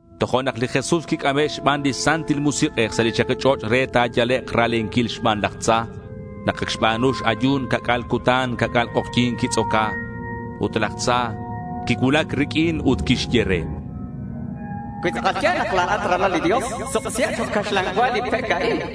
Tojo'nak li Jesús quic'ame' xban li Santil Musik'ej sa' li chaki ch'och' re ta̱yalek' ra̱lenquil xban laj tza. Nak ac xba̱nu x-ayu̱n ca'c'a̱l cutan ca'c'a̱l k'ojyi̱n quitz'oca. Ut laj tza quicuulac riq'uin ut quixye re: —Cui tz'akal ya̱l nak la̱at ralal li Dios, suk'isiheb chok' caxlan cua li pec a'in.—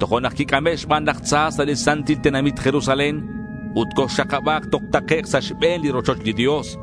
Tojo'nak quic'ame' xban laj tza sa' li santil tenamit Jerusalén; ut coxakaba̱k toj takec' sa' xbe̱n li rochoch li Dios.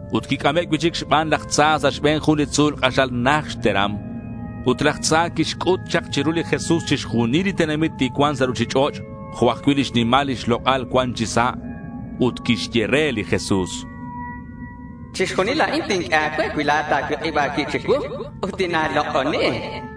Ut quic'ame' cui'chic xban laj tza sa' xbe̱n jun li tzu̱l k'axal najt xteram. Ut laj tza quixc'ut chak chiru li Jesús chixjunil li tenamit li cuan sa' ruchich'och' jo' ajcui' lix nimal lix lok'al cuan chi sa'. Ut quixye re li Jesús: —Chixjunil a'in tinq'ue a̱cue cui la̱at ta̱cuik'ib a̱cuib chicuu ut tina̱lok'oni.—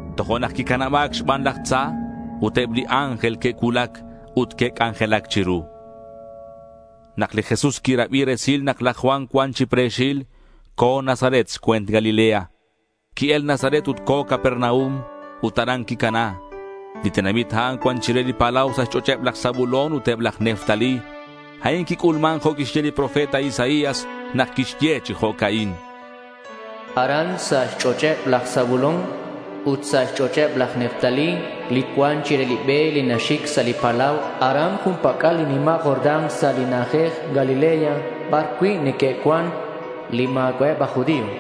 Tojo'nak quicanaba̱c xban laj tza ut eb li ángel que'cuulac ut que'c'anjelac chiru. Nak li Jesús quirabi resil nak laj Juan cuan chi pre̱xil, co̱ Nazaret xcue̱nt Galilea. Qui-el Nazaret ut co̱ Capernaum. Ut aran quicana. Li tenamit a'an cuan chire li palau sa' xch'och'eb laj Zabulón ut eb aj Neftalí. A'in quic'ulman jo' quixye li profeta Isaías nak quixye chi jo'ca'in: Aran sa' xch'och' laj Zabulón ut sa' xch'och' laj Neftalí, li cuan chire li be li naxic sa' li palau, aran jun pac'al li nima' Jordán, sa' li na'ajej Galilea bar neque'cuan cui' li ma̱cua'eb aj judío,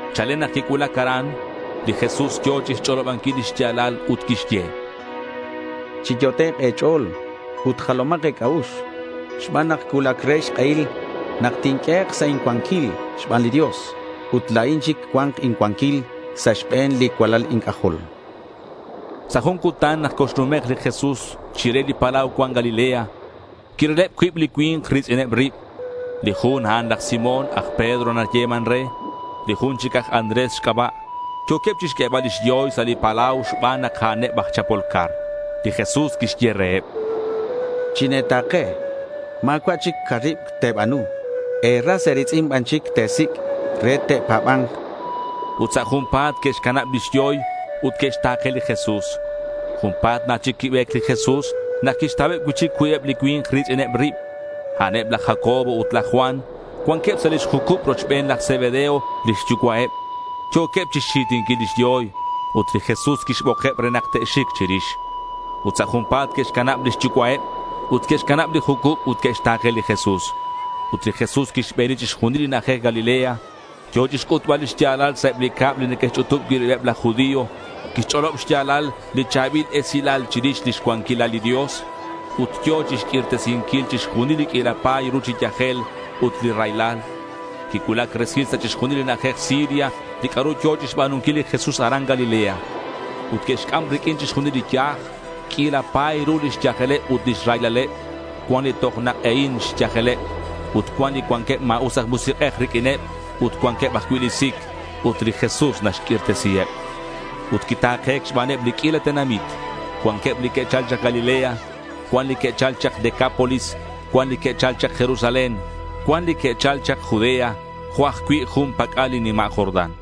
Chalen nak quicuulac aran, li Jesús yo̱ chixch'olobanquil li xya̱lal ut quixye: —Chiyot'ek' e̱ch'o̱l ut jalomak e̱c'a'ux xban nak cuulac re xk'ehil nak tinq'uehek' sa' incuanquil xban li Dios. Ut la̱in chic cua̱nk incuanquil sa' xbe̱neb li cualal inc'ajol.— Sa' jun cutan nak coxnumek' li Jesús chire li palau cuan Galilea, quirileb cuib li cui̱nk ri̱tz'ineb rib. Li jun, a'an laj Simón. Aj Pedro nayeman re. Li jun chic aj Andrés xc'aba'. Yo̱queb chixq'uebal lix yoy sa' li palau xban nak a'aneb aj chapol car. Li Jesús quixye reheb: —Chine̱ta̱ke. Ma̱cua' chic caribc te̱ba̱nu. E̱ras e̱ri̱tz'in ban chic te̱sic' re te'pa̱ba̱nk, chan reheb. Ut sa' junpa̱t que'xcanab lix yoy ut que'xta̱ke li Jesús. Junpa̱t na chic quibe̱c li Jesús nak quixtauheb cui'chic cuibeb li cui̱nk ri̱tz'ineb rib. A'aneb laj Jacobo ut laj Juan. Cuanqueb sa' lix jucub rochben laj Zebedeo lix yucua'eb. Yo̱queb chixxi̱tinquil lix yoy. Ut li Jesús quixbokeb re nak te'xic chirix. Ut sa' junpa̱t que'xcanab lix yucua'eb ut que'xcanab li jucub ut que'xta̱ke li Jesús. Ut li Jesús quixbeni chixjunil li na'ajej Galilea. Yo̱ chixc'utbal lix ya̱lal sa' eb li cab li neque'xch'utub cui' ribeb laj judío. Quixch'olob xya̱lal li cha̱bil esilal chirix lix cuanquilal li Dios. Ut yo̱ chixq'uirtesinquil chixjunil li q'uila pa̱y ru chi yajel ut li raylal. Quicuulac resil sa' chixjunil li na'ajej Siria li c'a'ru yo̱ chixba̱nunquil li Jesús aran Galilea. Ut que'xc'am riq'uin chixjunileb li yaj. Q'uila pa̱y ru lix yajeleb ut lix raylaleb. Cuan li toj nak'ehin xyajeleb. Ut cuan li cuanqueb ma̱us aj musik'ej riq'uineb ut cuanqueb ajcui' li sic. Ut li Jesús naxq'uirtesiheb. Ut quita̱ke̱c xbaneb li q'uila tenamit. Cuan li que'chal chak Galilea. Cuan li que'chal chak Decápolis. Cuan li que'chal chak Jerusalén. Cuan li que'chal chak Judea jo' ajcui' jun pac'al li nima' Jordán.